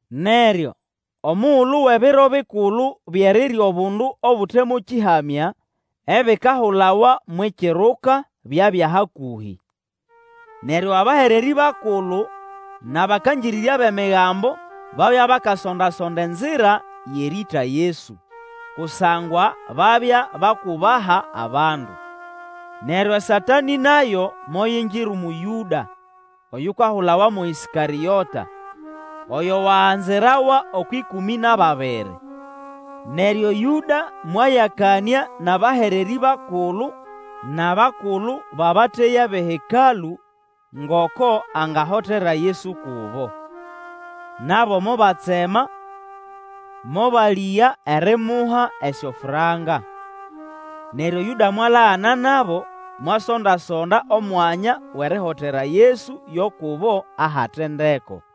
Neryo omugulu wʼEbiro Bikulu byʼerirya Obundu Obute mo Kĩhamya, ebikahulawa mwʼIkiruka, byabya hakũhĩ. Neryo abahererĩ bakulu nʼabakangĩrĩrya bʼEmigambo babya bakasonda-sonda enzira yʼerĩĩta Yesu; kusangwa babya bakubaha abandu. Neryo Satanĩ nayo moyingira umu Yũda; oyukahulawa mo Ĩskarĩota, oyo waganzirawa okwʼĩkũmĩ nʼababiri. Neryo Yũda mwayakanĩa nʼabahererĩ bakulu nʼabakulu nʼababateya bʼeHekalũ ngoko angahotera Yesu kubo. Nabo mobatsema, mobalĩga erimuha esyofranka. Neryo Yũda mwalagana nabo, mwasonda-sonda omwanya wʼerihotera Yesu yo kubo ahate ndeko.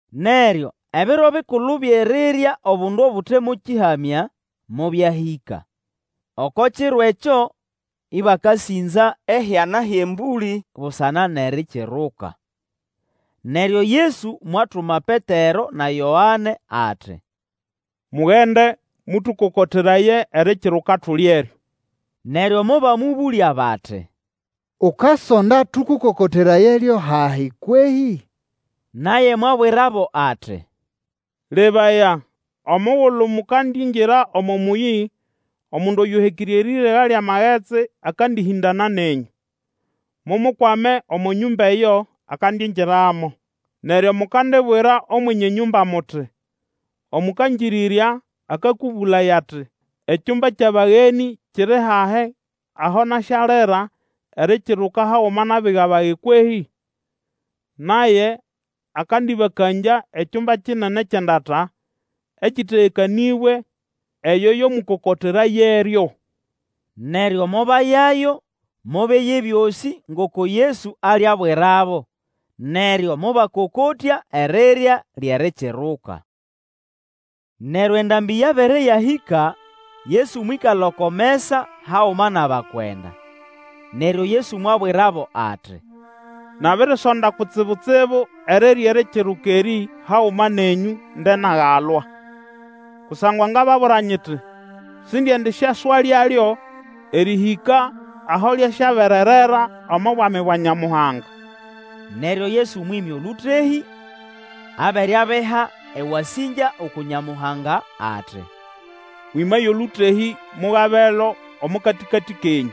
Neryo Ebiro Bikulu byʼerirya Obundu Obute mo Kĩhamya mobyahĩka. Oko kiro ekyo ĩbakasĩnza ehyana hyʼembũlĩ busana nʼErikiruka. Neryo Yesu mwatuma Petero na Yoane ati, Mugende, mũtũkokoteraye Erikiruka tulyeryo. Neryo mobamũbũlya bati, Ukasonda tũkokoterayeryo hahi kwehĩ? Naye mwabwirabo ati, Lebaya omugulu mukandingira omo mũyĩ, omundu oyũhekĩre erĩrega lyʼamagetsi akandĩhĩndana nenyũ. Mumukwame omo nyũmba eyo akandingiramo. Neryo mukandibwira Omwenye nyũmba muti, Omũkangĩrĩrya akakũbũlaya ati, Ekyumba kyʼabagenĩ kiri hahi aho nasyalira Erikiruka haguma nʼabiga bage kwehĩ? Naye akandĩbakangya ekyumba kinene kyʼendata, ekĩtegekanĩbwe; eyo yo mũkokoterayeryo. Neryo mobayayo mobeya ebyosĩ ngoko Yesu aliabwirabo, neryo mobakokotya erirya lyʼErikiruka. Neryo endambĩ yabere yabĩhĩka, Yesu mwĩkala oko mesa haguma nʼabakwenda. Neryo Yesu mwabwirabo ati, Nabirisonda kutsibu-tsibu erirya Erikiruka erĩ haguma nenyũ nde nagalwa! Kusangwa ngababwira nyiti, Sindiendisyaswalyalyo erĩhĩka aho lyasyabererera omo Bwami bwa Nyamuhanga. Neryo Yesu mwĩmya olũtehĩ, abere abiha ewasĩngya uku Nyamuhanga, ati, Mwĩmaye olũtehĩ mugabelo omo katĩkatĩ kenyũ.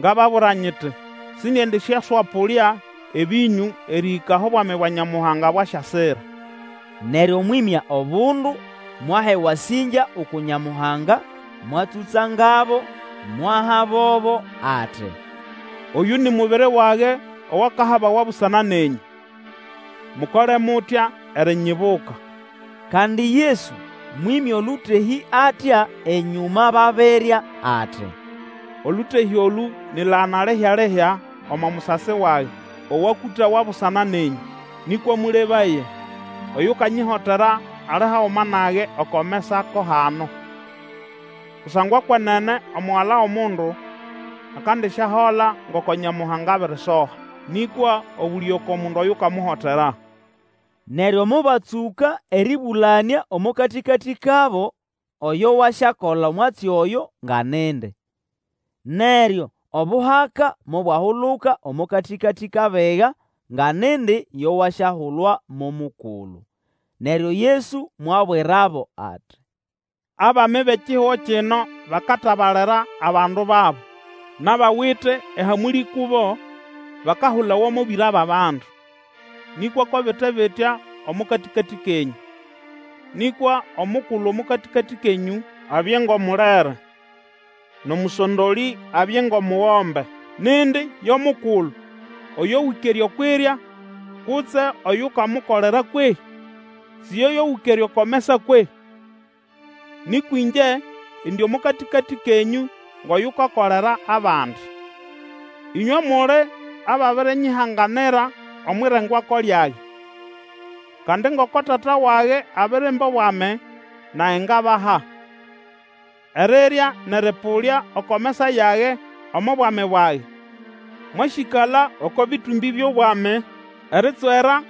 Ngababwira nyiti, Sindiendisyaswapũlya ebĩnyũ erĩhĩka aho Bwami bwa Nyamuhanga bwasyasira. Neryo mwĩmya obundu, mwaha ewasĩngya uku Nyamuhanga, mwatsũtsangabo, mwahabobo, ati, Oyũ ni mubiri wage owakahabawa busana nenyũ. Mukole mutya erinyibuka. Kandi Yesu mwĩmya olũtehĩ atya enyũma babirya, ati, Olũtehĩ olũ ni ʼlagana lihya-lihya omo musasi wage, owakũtawa busana nenyũ. Nĩkwa mũlebaye! Oyukanyihotera ali haguma nage oko mesa ko hano. Kusangwa kwenene Omugala wʼOmundu akandisyahola ngoko Nyamuhanga abirisoha; nĩkwa obũlĩge oko mundu oyukamuholera! Neryo mobatsũka erĩbũlanĩa omo katĩkatĩ kabo oyo wasyakola omwatsi oyo nga nindi. Neryo obuhaka mobwahuluka omo katĩkatĩ kʼabiga nga nindi yo wasyahulwa mo mukulu. Neryo Yesu mwabwirabo ati, Abami bʼekihugo kino bakatabalira abandu babo; nʼabawite ehamũlĩ kubo bakahulawa mo Bĩra bʼAbandu. Nĩkwa ko bite bitya omo katĩkatĩ kenyũ; nĩkwa omukulu omo katĩkatĩ kenyũ abye ngʼomulere, nʼomũsondolĩ abye ngʼomugombe. Nindi yo mukulu, oyo wĩkere okwʼirya, kutse oyukamukolera kwehĩ? Si yoyo wĩkere oko mesa kwehĩ? Nĩkwa ĩngye indi omo katĩkatĩ kenyũ ngʼoyukakolera abandi. Ĩnywe muli ababirinyihanganira omwʼirengwako lyage. Kandi ngoko Tata wage abirimba obwami, nage ngabaha erirya nʼerĩpũlya oko mesa yage omo bwami bwage. Mwasyĩkala oko bĩtũmbĩ byʼobwami eritswera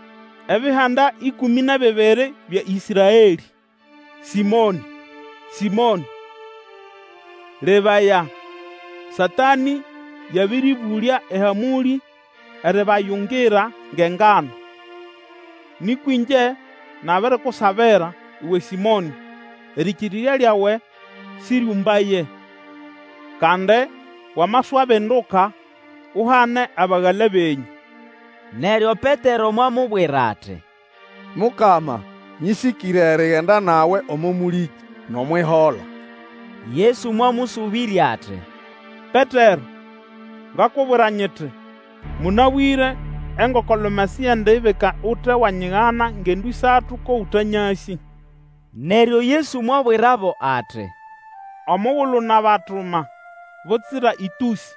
ebihanda ĩkũmĩ nʼebibiri bya Ĩsraelĩ. Sĩmonĩ! Sĩmonĩ! Lebaya! Satanĩ yabĩrĩbũlya ehamũlĩ eribayungira ngʼengano. Nĩkwa ĩngye nabirikusabira, uwe Sĩmonĩ, erĩkĩrĩrya lyawe sĩryũmbaye. Kandi wamaswabinduka, uhane abagala benyũ. Neryo Petero mwamubwira ati, Mukama, nyĩsĩkĩre erigenda nawe omo mũlĩkĩ, nʼomwʼihola. Yesu mwamũsũbĩrya ati, Petero, ngakubwira nyiti, Mũnabwĩre engoko-lume siyendibika ute wanyigana ngendo ĩsatu ko ũtanyasĩ. Neryo Yesu mwabwirabo ati, Omugulu nabatuma butsira ĩtũsĩ,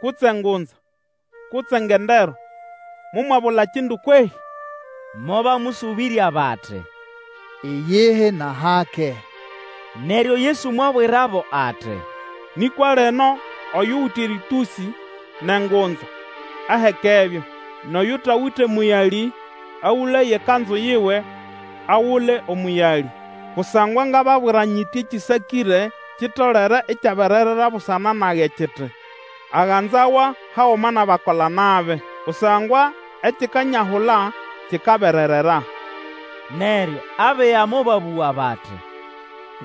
kutse ngunza, kutse ngendero, momwabula kindu kwehĩ? Mobamũsũbĩrya bati, Iyihi nʼahake. Neryo Yesu mwabwirabo ati, Nĩkwa lino oyuwite erĩtũsĩ nʼengunza, ahekebyo. Nʼoyutawite mũyalĩ, agũlaye ekanzu yiwe, agule omũyalĩ. Kusangwa ngababwira nyiti ekĩsakĩre kitolere ikyabererera busana nage kiti, Aganzawa haguma nʼabakola-nabi. Kusangwa ekikanyahula kikabererera. Neryo abiga mobabũga bati,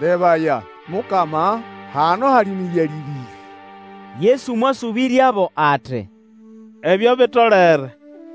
Lebaya! Mukama, hano hali mĩyalĩ ĩbĩrĩ! Yesu mwasũbĩryabo ati, Ebyo bitolere!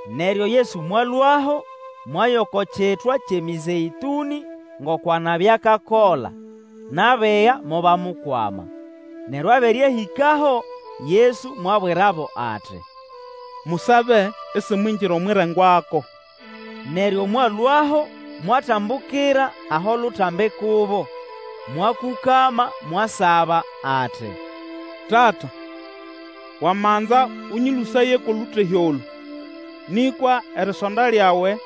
Neryo Yesu mwalũaho mwaya oko Kitwa kyʼeMĩzeĩtũnĩ ngoko anabya akakola; nʼabiga mobamukwama. Neryo abere ahĩkaho, Yesu mwabwirabo ati, Musabe isimwingira omwʼirengwako. Neryo mwalũaho mwatambukira aho lutambi kubo, mwakũkama, mwasaba ati, Tata, wamanza Ũnyĩlũsaye kwʼolũtehĩ olũ. Nĩkwa erisonda lyawe,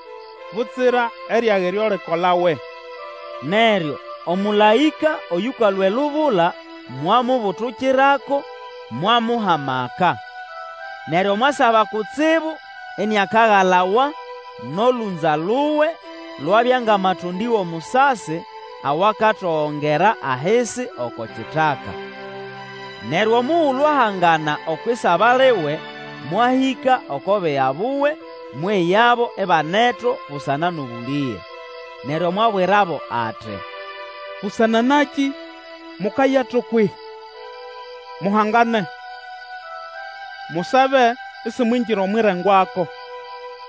butsira eryage lyo likolawe. Neryo omũlaĩka oyũkalũa elubula, mwamubutukirako, mwamuha amaka. Neryo mwasaba kutsibu iniakagalawa, nʼolũnza luwe lwabya ngʼamatondĩ wʼomusasi awakatogongera ahisi oko kitaka. Neryo omugulu ahangana okwʼisaba liwe, mwahĩka oko biga buwe, mweyabo ibaneto busana nʼobũlĩge. Neryo mwabwirabo ati, Busana nakĩ mukayato kwehĩ? Muhangane, musabe isimwingira omwʼirengwako.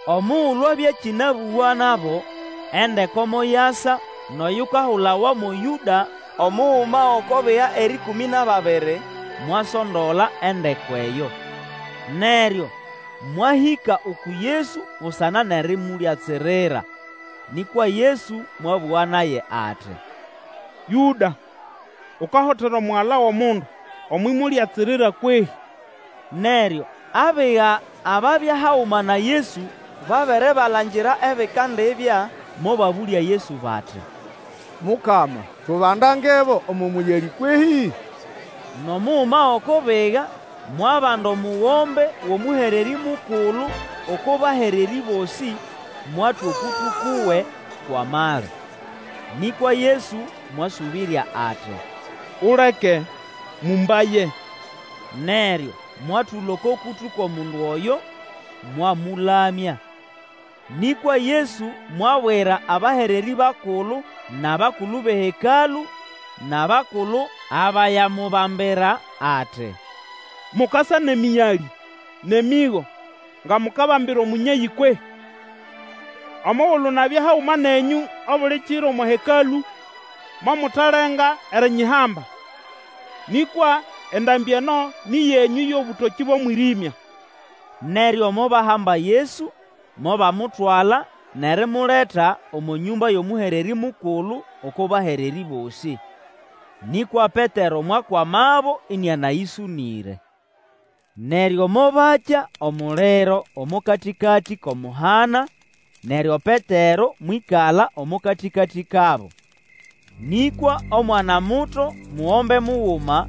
Omugulu abya akĩnabũga nabo, endeko moyasa, nʼoyukahulawa mo Yũda, omuguma gʼoko biga erĩkũmĩ nʼababiri, mwasondola endeko eyo. Neryo mwahĩka uku Yesu busana nʼerimulyatsirira. Nĩkwa Yesu mwabũga naye ati, Yũda, ukahotera Omugala wʼOmundu omwʼimulyatsirira kwehĩ? Neryo abiga ababya haguma na Yesu babere balangira ebikandibya, mobabũlya Yesu bati, Mukama, tubandangebo omo mũyalĩ kwehĩ? Nʼomuguma gʼoko biga mwabanda omugombe wʼomũhererĩ mukulu oko bahererĩ bosĩ, mwatwa okũtũ kuwe kwʼamali. Nĩkwa Yesu mwasũbĩrya ati, Uleke! Mũmbaye! Neryo mwatũla oko kũtũ kwʼomundu oyo mwamũlamya. Nĩkwa Yesu mwabwira abahererĩ bakulu nʼabakulu bʼeHekalũ nʼabakulu abayamubambira ati, Mukasa nʼemĩyalĩ nʼemĩgo nga mukabambira omũnyeyĩ kwehĩ? Omugulu nabya haguma nenyũ obuli kiro omo Hekalũ, momutalenga erinyihamba, nĩkwa endambĩ eno nĩ yenyũ nʼeyʼobũtokĩ bʼomwĩrĩmya. Neryo mobahamba Yesu, mobamutwala nʼerimuleta omo nyũmba yʼomũhererĩ mukulu oko bahererĩ bosĩ. Nĩkwa Petero mwakwamabo ĩnĩanayĩsũnĩre. Neryo mobakya omuliro omo katĩkatĩ kʼomuhana, neryo Petero mwĩkala omo katĩkatĩ kabo. Nĩkwa omwanamuto mugombe muguma,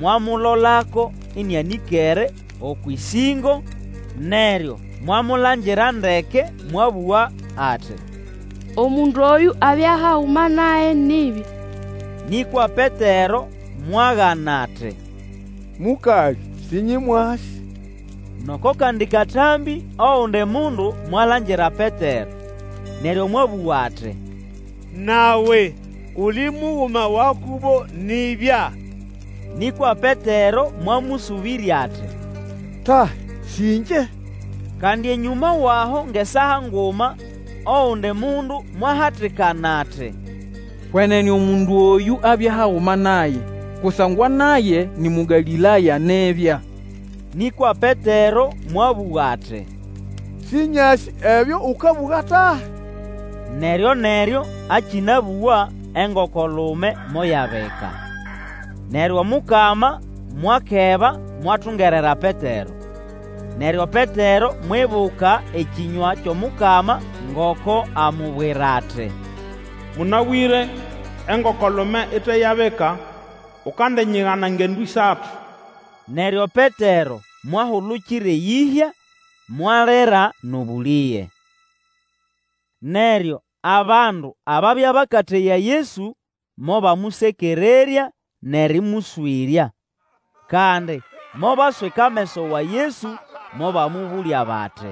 mwamulolako ĩnĩanĩkere okwʼĩsĩngo, neryo mwamulangira ndeke mwabũga ati, Omundu oyũ abya haguma naye nibya! Nĩkwa Petero mwagana ati, Mũkalĩ, sĩnyĩmwasĩ! Nʼoko kandi katambĩ ogundi mundu mwalangira Petero, neryo mwabũga ati, Nawe uli muguma wa kubo nibya. Nĩkwa Petero mwamũsũbĩrya ati, Tahi, sĩ ĩngye! Kandi enyũma wʼaho ngʼesaa nguma, ogundi mundu mwahatikana ati, Kwenene omundu oyũ abya haguma naye, kusangwa naye ni Mũgalĩlaya nibya. Nĩkwa Petero mwabũga ati, Sĩnyasĩ ebyo ũkabũga tahi! Neryo-neryo akĩnabũga engokolume moyabika. Neryo Omukama mwakeba mwatungerera Petero. Neryo Petero mwibuka ekĩnywa kyʼomukama ngoko amubwira ati, Mũnabwĩre, engoko-lume ite yabika, ukandinyigana ngendo ĩsatu. Neryo Petero mwahulukira eyĩhya, mwalira nʼobũlĩge! Neryo abandu ababya bakateya Yesu mobamũsekererya nʼerĩmũswĩrya. Kandi mobaswika ameso wa Yesu mobamũbũlya bati,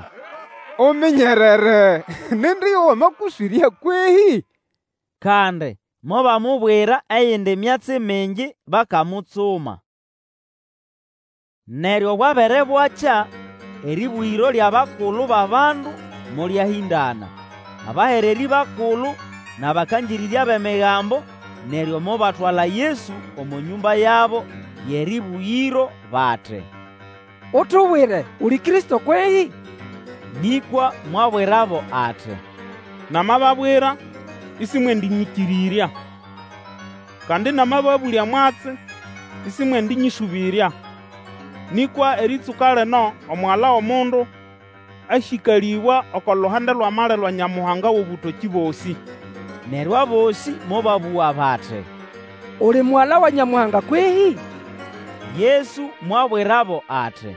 Uminyerere! Nindi yo wamakũswĩrya kwehĩ? Kandi mobamubwira eyindi myatsi mingi bakamutsuma. Neryo bwabere bwakya, erĩbũgĩro lyʼabakulu bʼabandu molyahĩndana, abahererĩ bakulu nʼabakangĩrĩrya bʼEmigambo, neryo mobatwala Yesu omo nyũmba yabo yʼerĩbũgĩro, bati, Utubwire, uli Kristo kwehĩ? Nĩkwa mwabwirabo ati, Namababwira isimwendinyĩkĩrĩrya. Kandi, namababũlya mwatsi, isimwendĩnyĩsũbĩrya. Nĩkwa erĩtsũka lino Omugala wʼOmundu asyĩkalĩbwa oko luhande lwʼamali lwa Nyamuhanga wʼobũtokĩ bosĩ. Neryo abosĩ mobabũga bati, Uli Mugala wa Nyamuhanga kwehĩ? Yesu mwabwirabo ati,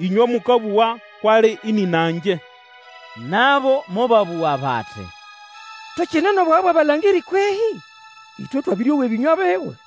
Ĩnywe mũkabũga kwʼali ĩnĩna ngye. Nabo mobabũga bati, Tukine nʼobwaga bwʼabalangĩrĩ kwehĩ? Ĩtwe twabĩrĩowa ebĩnywa biwe.